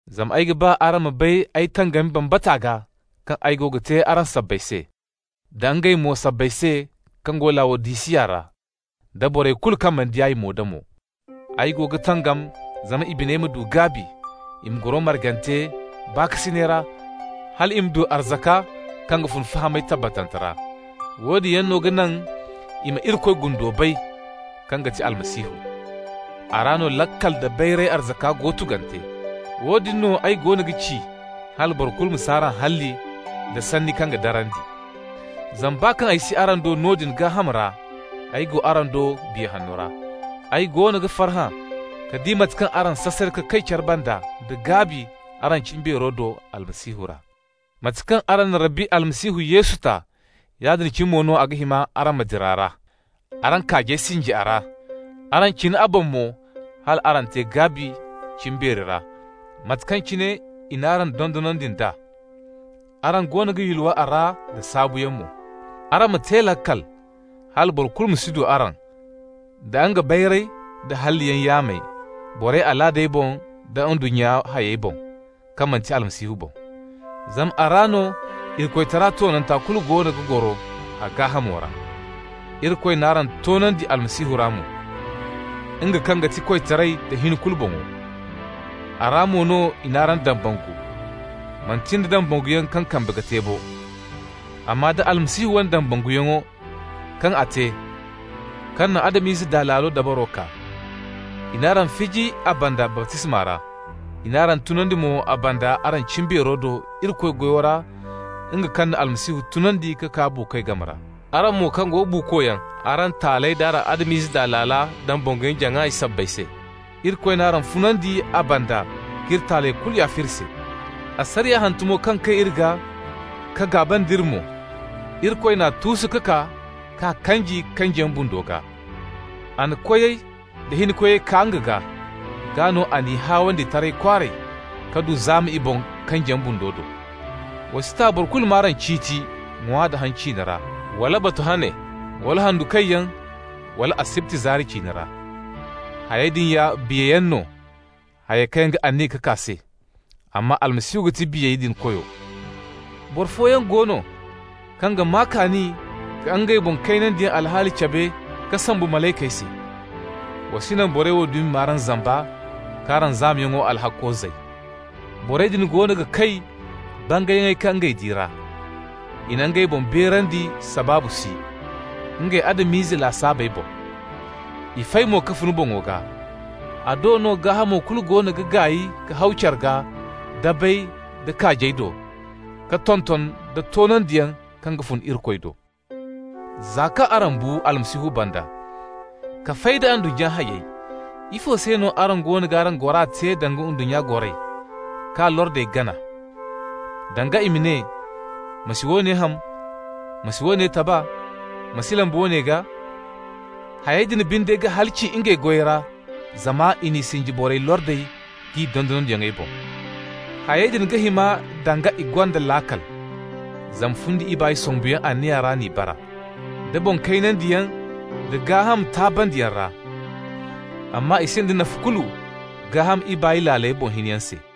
Zama ay ga ba araŋ ma bay ay tangami bambata gaa kaŋ ay go ga te araŋ sabbay se, da ngey mo sabbay se kaŋ go Lawodisiya ra, da borey kulu mo kaŋ mana di ay mo-da-mo. Ay go ga tangam zama i biney ma du gaabi, i ma goro margante baakasinay ra hal i ma du arzaka kaŋ ga fun fahamay tabbatante ra. Woodin yaŋ no ga naŋ i ma Irikoy gundo bay, kaŋ ga ti Almasihu. A ra no laakal da bayray arzaka kulu go tugante. Woodin no ay goono ga ci hala boro kulu ma si araŋ halli nda sanni kaŋ ga darandi. Zama baa kaŋ ay si araŋ do noodin gaaham ra, ay go araŋ do Biya Hanno ra. Ay goono ga farhã ka di mate kaŋ araŋ sasare ka kay care banda nda gaabi araŋ cimbeero do Almasihu ra. Mate kaŋ araŋ na Rabbi Almasihu Yesu ta, yaadin cine mo no a ga hima araŋ ma dira a ra. Araŋ kaajey sinji a ra. Araŋ cina a boŋ mo hal araŋ te gaabi cimbeeri ra, mate kaŋ cine i n'araŋ dondonandi nd'a. Araŋ goono ga yulwa a ra da saabuyaŋ mo. Araŋ ma te laakal hala boro kulu ma si du araŋ da nga bayray da halliyaŋ yaamey, borey alaadey boŋ da ndunnya hayey boŋ, kaŋ manti Almasihu boŋ. Zama a ra no Irikoytara toonanta kulu goono ga goro a gaahamo ra. Irikoy n'araŋ toonandi Almasihu ra mo, nga kaŋ ga ti koytaray da hin kulu boŋo. A ra mo no i n'araŋ dambangu, manti nda dambanguyaŋ kaŋ kambe ga te bo, amma da Almasihu wane dambanguyaŋo kaŋ a te, kaŋ na Adam-ize daa laalo dabaro kaa. I n'araŋ fiji a banda baptisma ra, i n'araŋ tunandi mo a banda, araŋ cimbeero do Irikoy goyo ra, nga kaŋ na Almasihu tunandi ka kaa buukoy game ra. Araŋ mo kaŋ go buukoyaŋ araŋ taaley d'araŋ Adam-ize daa laala dambanguyaŋ-jaŋay sabbay se, Irikoy n'araŋ funandi a banda k'iri taaley kulu yaafa iri se. Asariya hantumo kaŋ kay iri gaa ka gaaba nd'iri mo, Irikoy n'a tuusu ka kaa k'a kanji kanjiyaŋ bundo gaa. A na koyey da hinkoyey kaa nga gaa. Gaa no a n'i haawandi taray kwaaray ka du zaama i boŋ kanjiyaŋ bundo do. Wa si ta boro kulu m'araŋ ciiti ŋwa da haŋ ciine ra, wala batu hane, wala handu kayyaŋ, wala asibti zaari ciine ra. Hayey din ya biyayaŋ no hayey kaŋ yaŋ ga aniya ka kaa se, amma Almasihu ga ti biyey din Koyo. Boro fooyaŋ go no kaŋ ga maa kaani ka ngey boŋ kaynandiyaŋ alhaali cabe ka sombu malaykey se. Wa si naŋ borey wo dumi m'araŋ zamba k'araŋ zaamayaŋ alhakko zay. Borey din goono ga kay bangayyaŋey kaŋ ngey di ra. I ga ngey boŋ beerandi sabaabu si, ngey Adam-ize lasaabey boŋ. I fay no ka fun boŋo gaa. A do no gaahamo kulu goono ga gaay ka haw care gaa dabey da kaajey do, ka tonton da toonandiyaŋ kaŋ ga fun Irikoy do. Za kaŋ araŋ bu Almasihu banda ka fay da ndunnya hayey, ifo se no araŋ goono g'araŋ gora te danga ndunnya goray, k'a lordey gana. Danga i ma ne: «Ma si woone ham! Ma si woone taba! Ma si lamba woone gaa!» Hayey din binde ga halaci ngey goyey ra, zama i n'i sinji borey lordey d'i dondonandiyaŋey boŋ. Hayey din ga hima danga i gonda laakal, zama fundi ibaay sombuyaŋ anniya ra n'i bara, da boŋ kaynandiyaŋ da gaaham taabandiyaŋ ra, amma i sinda nafa kulu gaaham ibaay laaley boŋ hiniyaŋ se.